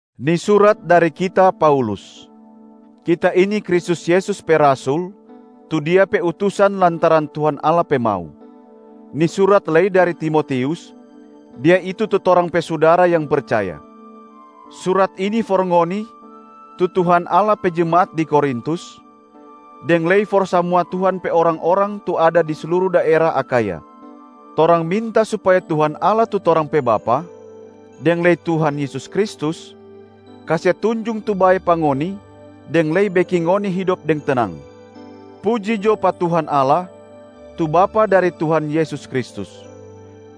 Ni surat dari kita, Paulus. Kita ini Kristus Yesus pe rasul tu Dia pe utusan lantaran Tuhan Allah pe mau. Ni surat lei dari Timotius, dia itu tu torang pe sudara yang percaya. Surat ini for ngoni tu Tuhan Allah pe jemaat di Korintus, deng lei for samua Tuhan pe orang-orang tu ada di sluru daera Akhaya. Torang minta supaya Tuhan Allah tu torang pe Bapa deng lei Tuhan Yesus Kristus kase tunjung tu bae pa ngoni deng lei beking ngoni hidop deng tenang. Puji jo pa Tuhan Allah, tu Bapa dari Tuhan Yesus Kristus.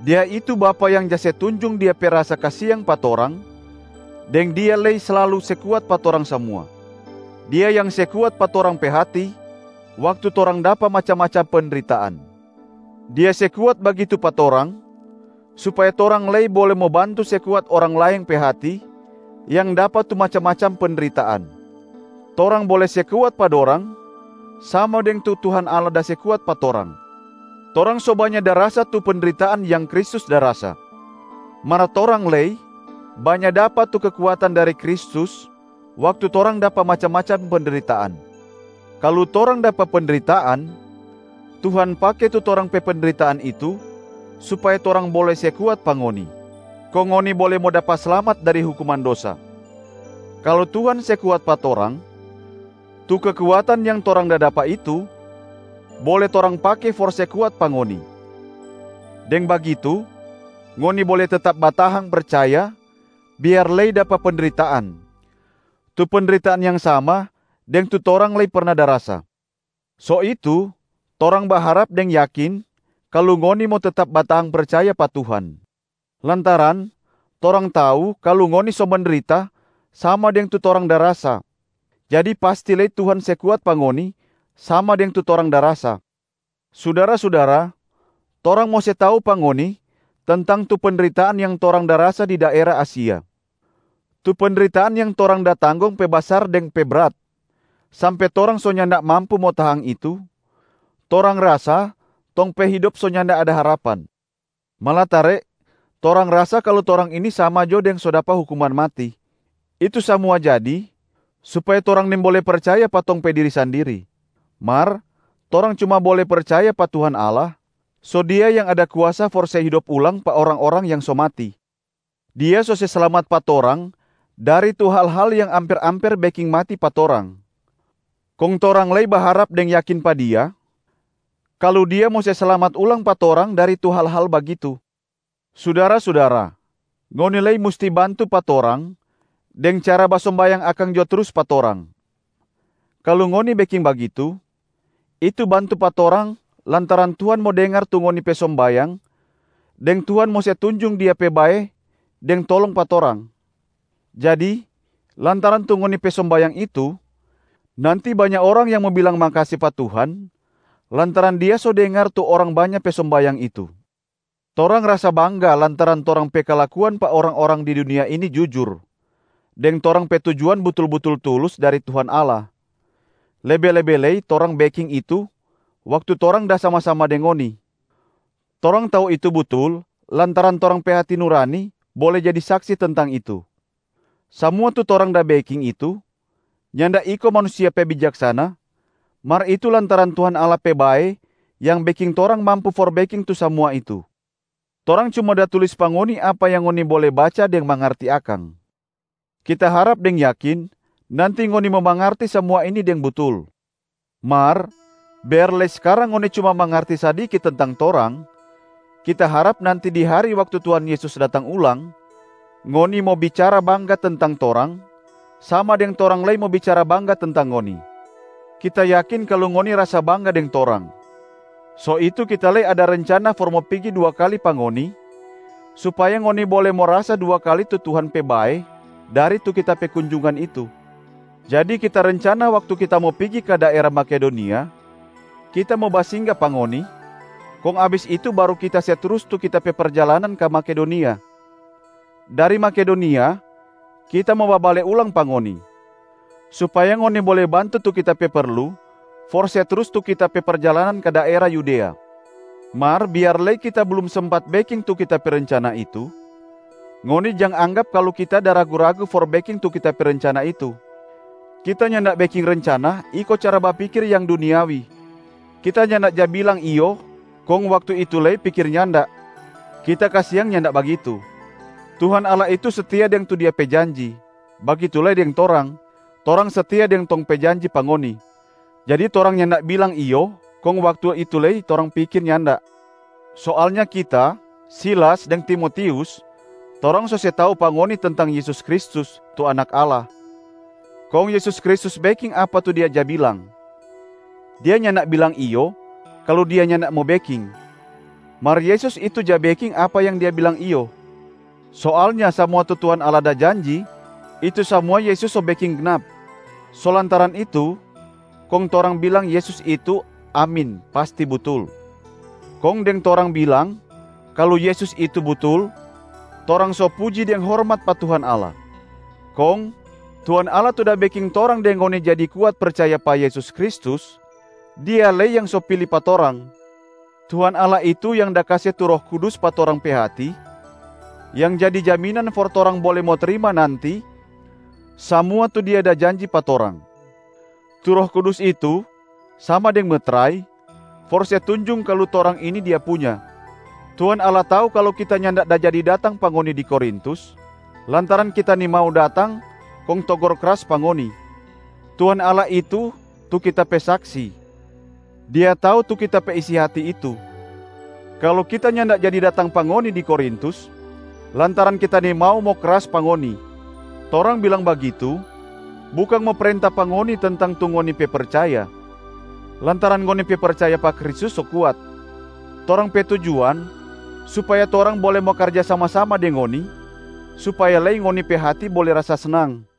Dia itu Bapa yang ja se tunjung Dia pe rasa kasiang pa torang deng Dia lei slalu se kuat pa torang samua. Dia yang se kuat pa torang pe hati waktu torang da dapa macam-macam pendritaan. Dia se kuat bagitu pa torang supaya torang lei bole mo bantu se kuat orang laeng pe hati yang dapa tu macam-macam pendritaan. Torang bole se kuat pa dorang sama deng tu Tuhan Allah da se kuat pa torang. Torang so banya da rasa tu pendritaan yang Kristus da rasa, mar torang lei banya dapa tu kekuatan dari Kristus waktu torang dapa macam-macam pendritaan. Kalu torang dapa pendritaan, Tuhan pake tu torang pe pendritaan itu supaya torang bole se kuat pa ngoni, kong ngoni bole mo dapa slamat dari hukuman dosa. Kalu Tuhan se kuat pa torang, tu kekuatan yang torang da dapa itu bole torang pake for se kuat pa ngoni. Deng bagitu ngoni bole tetap batahang percaya biar lei dapa pendritaan, tu pendritaan yang sama deng tu torang lei perna da rasa. So itu torang baharap deng yakin kalu ngoni mo tetap batahang percaya pa Tuhan, lantaran torang tau kalu ngoni so mendrita sama deng tu torang da rasa, jadi pasti lei Tuhan se kuat pa ngoni sama deng tu torang da rasa. Sudara-sudara, torang mo se tau pa ngoni tentang tu pendritaan yang torang da rasa di daera Asia. Tu pendritaan yang torang da tanggong pe basar deng pe brat, sampe torang so nyanda mampu mo tahang itu, torang rasa tong pe hidop so nyanda ada harapan. Malatare torang rasa kalu torang ini sama jo deng so dapa hukuman mati. Itu samua jadi supaya torang nimbole percaya pa tong pe diri sandiri, mar torang cuma bole percaya pa Tuhan Allah, so Dia yang ada kuasa for se hidop ulang pa orang-orang yang so mati. Dia so se slamat pa torang dari tu hal-hal yang amper-amper beking mati pa torang, kong torang lei baharap deng yakin pa Dia kalu Dia mo se slamat ulang pa torang dari tu hal-hal bagitu. Sudara-sudara, ngoni lei musti bantu pa torang deng cara basombayang akang jo trus pa torang. Kalu ngoni beking bagitu, itu bantu pa torang lantaran Tuhan mo dengar tu ngoni pe sombayang deng Tuhan mo se tunjung Dia pe bae deng tolong pa torang. Jadi lantaran tu ngoni pe sombayang itu, nanti banya orang yang mo bilang makase pa Tuhan lantaran Dia so dengar tu orang banya pe sombayang itu. Torang rasa bangga lantaran torang pe kalakuan pa orang-orang di dunia ini jujur deng torang pe tujuan butul-butul tulus dari Tuhan Allah, lebe-lebe lei torang beking itu waktu torang da sama-sama deng ngoni. Torang tau itu butul lantaran torang pe hati nurani bole jadi saksi tentang itu. Samua tu torang da beking itu nyanda iko manusia pe bijaksana, mar itu lantaran Tuhan Allah pe bae yang beking torang mampu for beking tu samua itu. Torang cuma da tulis pa ngoni apa yang ngoni bole baca deng mangarti akang. Kita harap deng yakin nanti ngoni mo mangarti samua ini deng butul. Mar biar lei skarang ngoni cuma mangarti sadiki tentang torang, kita harap nanti di hari waktu Tuhan Yesus datang ulang, ngoni mo bicara bangga tentang torang, sama deng torang lei mo bicara bangga tentang ngoni. Kita yakin kalu ngoni rasa bangga deng torang, so itu kita lei ada rencana for mo pigi dua kali pa ngoni supaya ngoni bole mo rasa dua kali tu Tuhan pe bae dari tu kita pe kunjungan itu. Jadi kita rencana waktu kita mo pigi ka daera Makedonia, kita mo basingga pa ngoni, kong abis itu baru kita se trus tu kita pe perjalanan ka Makedonia. Dari Makedonia kita mo babale ulang pa ngoni, supaya ngoni bole bantu tu kita pe perlu for se trus tu kita pe perjalanan ka daera Yudea. Mar biar lei kita blum sempat beking tu kita pe rencana itu, ngoni jang anggap kalu kita da ragu-ragu for beking tu kita pe rencana itu. Kita nyanda beking rencana iko cara bapikir yang duniawi. Kita nyanda ja bilang ‘iyo’ kong waktu itu lei pikir ‘nyanda’. Kita kasiang nyanda bagitu. Tuhan Allah itu setia deng tu Dia pe janji, bagitu lei deng torang, torang setia deng tong pe janji pa ngoni. Jadi torang nyanda bilang ‘iyo’ kong waktu itu lei torang pikir ‘nyanda’. Soalnya kita, Silas deng Timotius, torang so se tau pa ngoni tentang Yesus Kristus, tu Anak Allah. Kong Yesus Kristus beking apa tu Dia ja bilang. Dia nyanda bilang ‘iyo’, kalu Dia nyanda mo beking, mar Yesus itu ja beking apa yang Dia bilang ‘iyo’. Soalnya samua tu Tuhan Allah da janji, itu samua Yesus so beking gnap. So lantaran itu kong torang bilang Yesus itu, “Amin, pasti butul”. Kong deng torang bilang kalu Yesus itu butul, torang so puji deng hormat pa Tuhan Allah. Kong Tuhan Allah tu da beking torang deng ngoni jadi kuat percaya pa Yesus Kristus, Dia lei yang so pili pa torang. Tuhan Allah itu yang da kase tu Roh Kudus pa torang pe hati yang jadi jaminan for torang bole mo trima nanti samua tu Dia da janji pa torang. Tu Roh Kudus itu sama deng metrai for se tunjung kalu torang ini Dia punya. Tuhan Allah tau kalu kita nyanda da jadi datang pa ngoni di Korintus lantaran kita nimau datang kong togor kras pa ngoni. Tuhan Allah itu tu kita pe saksi, Dia tau tu kita pe isi hati itu, kalu kita nyanda jadi datang pa ngoni di Korintus lantaran kita nimau mo kras pa ngoni. Torang bilang bagitu bukang mo prenta pa ngoni tentang tu ngoni pe percaya, lantaran ngoni pe percaya pa Kristus so kuat. Torang pe tujuan supaya torang bole mo karja sama-sama deng ngoni supaya lei ngoni pe hati bole rasa snang.